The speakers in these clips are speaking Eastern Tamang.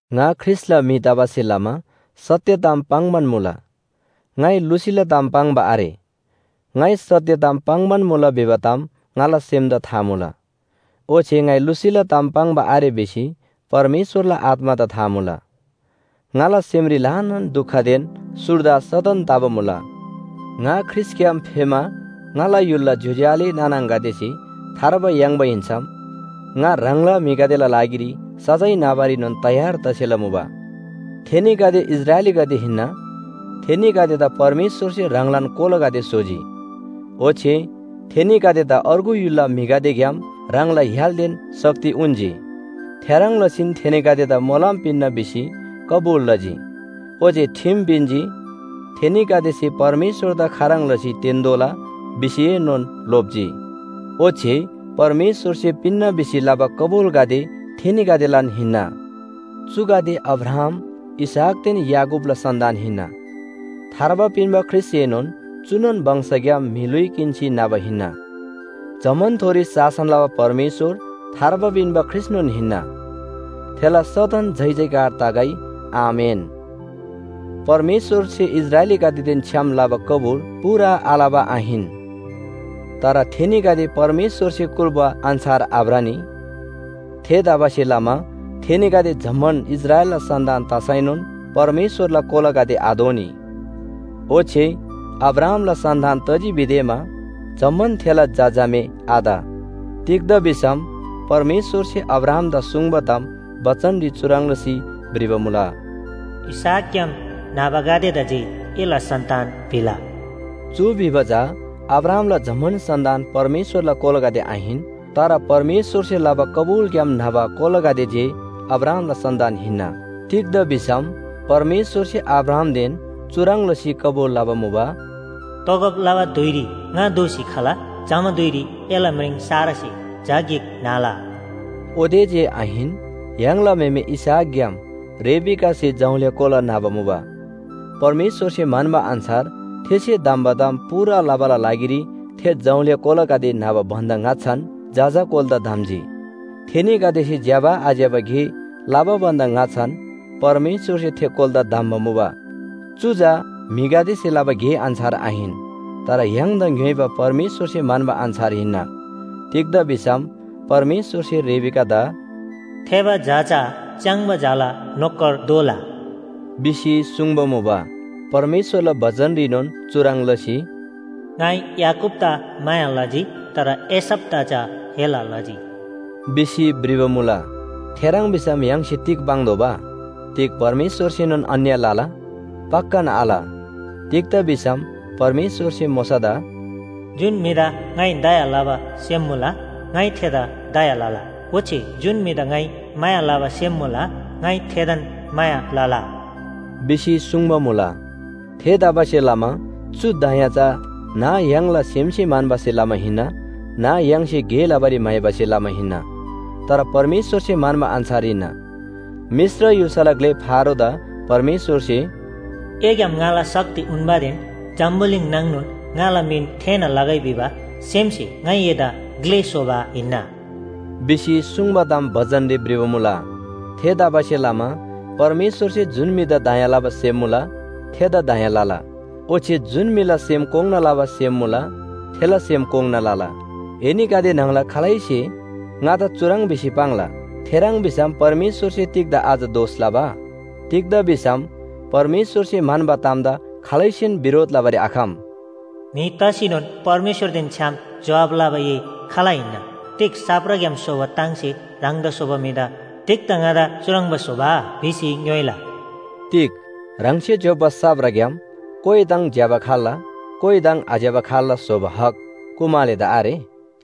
ङा ख्रीष्‍टला म्‍हि तबासे लमा सत्‍य ताम पाङ्‌बान मुला, ङाइ लुसीला ताम पाङ्बा आरे। ङाइ सत्‍य ताम पाङ्‌बान मुला भिबा ताम ङाला सेमदा था मुला, ओच्‍छे ङाइ लुसीला ताम पाङ्बा आरे भिसी परमेश्‍वरला आत्‍मादा था मुला। ङाला सेमरी ल्‍हानान दुखदेन सुर्दा सदन तबा मुला। ङा ख्रीष्‍टग्‍याम फेमा ङाला य्‍हुलला ज्‍योज्‍यो आले नाना आङागदेसे थार्बा याङ्बा हिन्‍सम ङा ह्राङला म्‍हिगदेला लागिरी सजाय नाबारीनोन तयार तसेला मुबा। थेनीगदे इस्राएलीगदे हिन्‍ना, थेनीगदेदा परमेश्‍वरसे ह्राङलान कोलागदे स्‍होजी, ओच्‍छे थेनीगदेदा अर्गु य्‍हुलला म्‍हिगदेग्‍याम ह्राङला य्‍हालदेन शक्ति उन्‍जी। थेह्रङ् लसीन थेनीगदेदा मोलम पिन्‍ना भिसी कबुल लजी, ओच्‍छे ठिम पिन्‍जी। थेनीगदेसे परमेश्‍वरदा खाह्रङ् लसी तेन्‍तोःला भिसीएनोन लोप्‍जी, ओच्‍छे परमेश्‍वरसे पिन्‍ना भिसी लबा कबुलगदे थेनीगदेलान हिन्‍ना। चुगदे अब्राहाम, इसहाकदेन याकूबला सन्‍तान हिन्‍ना। थार्बा पिन्‍बा ख्रीष्‍टएनोन चुनोन वंशग्‍याम म्‍हि ल्‍हुइ किन्‍सी न्‍हबा हिन्‍ना। जम्‍मानथोरी शासन लबा परमेश्‍वर थार्बा पिन्‍बा ख्रीष्‍टनोन हिन्‍ना। थेला सदन जयजयकार तगै। आमेन। परमेश्‍वरसे इस्राएलीगदेदेन छ्‌याम लबा कबुल पूरा आलबा आहिन, तर थेनीगदे परमेश्‍वरसे कुल्‍बा अन्‍छार आभ्रनी। थेतबासेलमा थेनीगदे जम्‍मान इस्राएलला सन्‍तान तसैनोन परमेश्‍वरला कोलागदे आदोनी। ओच्‍छे अब्राहामला सन्‍तान तजी भिदेमा जम्‍मान थेला झा झामे आत। तिग्‍दा भिसम परमेश्‍वरसे अब्राहामदा सुङ्बा ताम बचनरी चुह्रङ् लसी भ्रिबा मुला, “इसहाकग्‍याम न्‍हबागदेदा जे एला सन्‍तान भिला।” चु भिबा चा अब्राहामला जम्‍मान सन्‍तान परमेश्‍वरला कोलागदे आहिन। तर परमेश्‍वरसे लबा कबुलग्‍याम न्‍हबा कोलागदे जे अब्राहामला सन्‍तान हिन्‍ना। तिग्‍दा भिसम परमेश्‍वरसे अब्राहामदेन चुह्रङ् लसी कबुल लबा मुबा, “तोगब लबा धुइरी ङा दोःसी खला, जमा धुइरी एला म्रिङ सारासे झा गिक न्‍हला।” ओते जे आहिन, य्‍हाङला म्‍हेमे इसहाकग्‍याम रिबेकासे जौल्‍या कोला न्‍हबा मुबा। परमेश्‍वरसे म्‍हन्‍बा अन्‍छार थेसे धम्‍बा ताम पूरा लबाला लागिरी थे जौल्‍या कोलागदे न्‍हबा भन्‍दा ङाच्‍छान जजा कोलादा धम्‍जी। थेनीगदेसे ज्‍यबा आज्‍यबा गे लबा भन्‍दा ङाच्‍छान परमेश्‍वरसे थे कोलादा धम्‍बा मुबा। चु चा म्‍हिगदेसे लबा गे अन्‍छार आहिन, तर य्‍हाङदा ङ्‌योइबा परमेश्‍वरसे म्‍हन्‍बा अन्‍छार हिन्‍ना। तिग्‍दा भिसम परमेश्‍वरसे रिबेकादा “थेबा झा चा च्‍याङ्बा झाला नोकर दोला” भिसी सुङ्बा मुबा। परमेश्‍वरला बचनरीनोन चुह्रङ् लसी, “ङाइ याकूबदा माया लजी, तर एसावदा चा हेला लजी” भिसी भ्रिबा मुला। थेह्रङ् भिसम य्‍हाङसे तिग पाङ्तोःबा? तिग परमेश्‍वरसेनोन अन्‍याय लला? पक्‍कान आल! तिग्‍दा भिसम परमेश्‍वरसे मोशादा, “जुन म्‍हिदा ङाइ दया लबा सेम मुला, ङाइ थेदा दया लला। ओच्‍छे जुन म्‍हिदा ङाइ माया लबा सेम मुला, ङाइ थेदान माया लला” भिसी सुङ्बा मुला। थेतबासेलमा चु दया चा न्‍ह य्‍हाङला सेमसे म्‍हन्‍बासे लमा हिन्‍ना न्‍ह य्‍हाङसे गे लबारी म्‍हाइबासे लमा हिन्‍ना, तर परमेश्‍वरसे म्‍हन्‍बा अन्‍छार हिन्‍ना। मिश्र य्‍हुल्‍साला ग्‍ले फारोदा परमेश्‍वरसे “एग्‍याम ङाला शक्ति उन्‍बादेन जम्‍बुलिङ नाङनोन ङाला मिन थेःना लगै भिबा सेमसे ङाइ एदा ग्‍ले स्‍होबा हिन्‍ना” भिसी सुङ्बा ताम बचनरी भ्रिबा मुला। थेतबासेलमा परमेश्‍वरसे जुन म्‍हिदा दया लबा सेम मुला थेदा दया लला, ओच्‍छे जुन म्‍हिला सेम कोङ्‌ना लबा सेम मुला थेला सेम कोङ्‌ना लला। एनीगदे न्‍हङला खालैसे ङादा चुह्रङ् भिसी पाङ्ला, “थेह्रङ् भिसम परमेश्‍वरसे तिग्‍दा अझ दोष लबा? तिग्‍दा भिसम परमेश्‍वरसे म्‍हन्‍बा तामदा खालैसेन बिरोध लबारी आखम।” म्‍हि तसीनोन परमेश्‍वरदेन छ्‌याम जोहाब लबा ए खाल हिन्‍ना? तिग साप्राग्‍याम स्‍होबा ताङसे ह्राङदा स्‍होबा म्‍हिदा “तिग्‍दा ङादा चुह्रङ्बा स्‍होबा?” भिसी ङ्‌योइला। तिग ह्राङसे ज्‍योप्‍बा साप्राग्‍याम कोइ ताङ ज्‍यबा खाल्‍ला, कोइ ताङ आज्‍यबा खाल्‍ला स्‍होबा हक कुमालेदा आरे?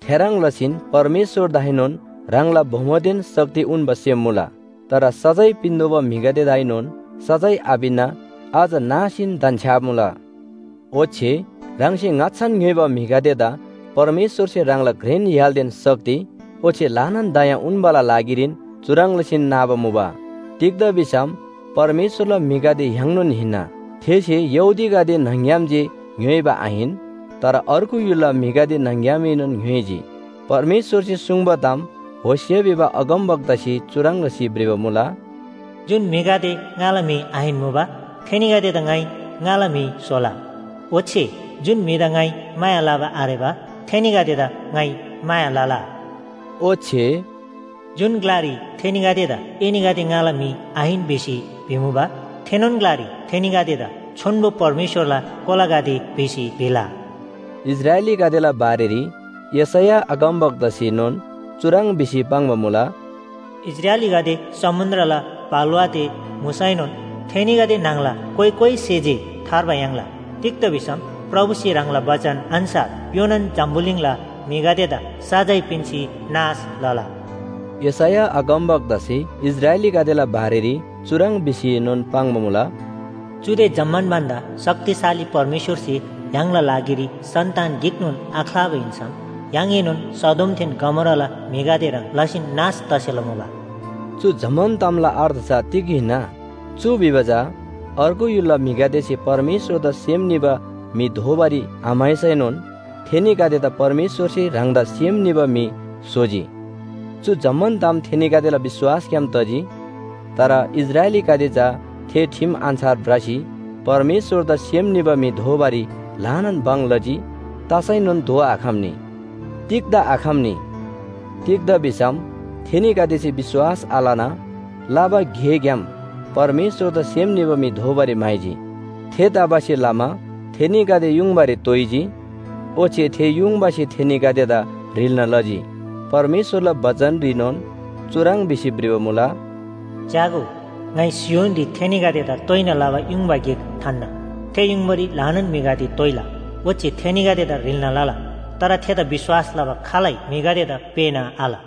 थेह्रङ् लसीन परमेश्‍वरदाएनोन ह्राङला बोमोदेन शक्ति उन्‍बा सेम मुला। तर सजाय पिन्‍तोःबा म्‍हिगदेदाएनोन सजाय आपिन्‍ना अझ नासीन धन्‍छ्‌याबा मुला। ओच्‍छे ह्राङसे ङाच्‍छान ङ्‌योइबा म्‍हिगदेदा परमेश्‍वरसे ह्राङला घ्रेन य्‍हालदेन शक्ति ओच्‍छे ल्‍हानान दया उन्‍बाला लागिरीन चुह्रङ् लसी नाबा मुबा। तिग्‍दा भिसम परमेश्‍वरला म्‍हिगदे य्‍हाङनोन हिन्‍ना। थेसे यहूदीगदे न्‍हङ‍ग्‍याम जे ङ्‌योइबा आहिन, तर अर्गु य्‍हुलला म्‍हिगदे न्‍हङग्‍यामएनोन ङ्‌योइजी। परमेश्‍वरसे सुङ्बा ताम होशे भिबा अगमवक्तासे चुह्रङ् लसी भ्रिबा मुला, “जुन म्‍हिगदे ‘ङाला म्‍हि आहिन्‍मुबा,’ थेनीगदेदा ङाइ ‘ङाला म्‍हि स्‍होला।’ ओच्‍छे जुन म्‍हिदा ‘ङाइ माया लबा आरेबा,’ थेनीगदेदा ‘ङाइ माया लला।’” ओच्‍छे, “जुन ग्‍लारी थेनीगदेदा, ‘एनीगदे ङाला म्‍हि आहिन’ भिसी भिमुबा, थेनोन ग्‍लारी थेनीगदेदा, ‘छोन्‍बो परमेश्‍वरला कोलागदे’ भिसी भिला।” इस्राएलीगदेला बारेरी यशैया अगमवक्तासेनोन चुह्रङ् भिसी पाङ्बा मुला, “इस्राएलीगदे समुन्‍द्रला बालुवा ते मुसैनोन थेनीगदे न्‍हङला कोइ कोइसे जे थार्बा याङ्ला। तिग्‍दा भिसम प्रभुसे ह्राङला बचन अन्‍छार योनान जम्‍बुलिङला म्‍हिगदेदा सजाय पिन्‍सी नाश लला।” यशैया अगमवक्तासे इस्राएलीगदेला बारेरी चुह्रङ् भिसीनोन पाङ्बा मुला, “चुदे जम्‍मान भन्‍दा शक्तिशाली परमेश्‍वरसे य्‍हाङला लागिरी सन्‍तान गिकनोन आख्‍लाबा हिन्‍सम य्‍हाङएनोन सदोमदेन गमोराला म्‍हिगदे ह्रङ् लसीन नाश तसेला मुबा।” चु जम्‍मान तामला अर्थ चा तिग हिन्‍ना? चु भिबा चा अर्गु य्‍हुलला म्‍हिगदेसे परमेश्‍वरदा सेम निबा म्‍हि दोबारी आम्‍हाइसैनोन थेनीगदेदा परमेश्‍वरसे ह्राङदा सेम निबा म्‍हि स्‍होजी। चु जम्‍मान ताम थेनीगदेला विश्‍वासग्‍याम तजी। तर इस्राएलीगदे चा थे ठिम अन्‍छार भ्रसी परमेश्‍वरदा सेम निबा म्‍हि दोबारी ल्‍हानान भङ लजी तसैनोन दोआखम्‍नी। तिग्‍दा आखम्‍नी? तिग्‍दा भिसम थेनीगदेसे विश्‍वास आलना लबा गेग्‍याम परमेश्‍वरदा सेम निबा म्‍हि दोबारी म्‍हाइजी। थेतबासेलमा थेनीगदे युङबारी तोइजी, ओच्‍छे थे युङबासे थेनीगदेदा ह्रिल्‍ना लजी। परमेश्‍वरला बचनरीनोन चुह्रङ् भिसी भ्रिबा मुला, “च्‍यागो, ङाइ सियोनरी थेनीगदेदा तोइना लबा युङबा गिक थान्‍ना, थे युङबारी ल्‍हानान म्‍हिगदे तोइला ओच्‍छे थेनीगदेदा ह्रिल्‍ना लला। तर थेदा विश्‍वास लबा खालै म्‍हिगदेदा पेःना आल।”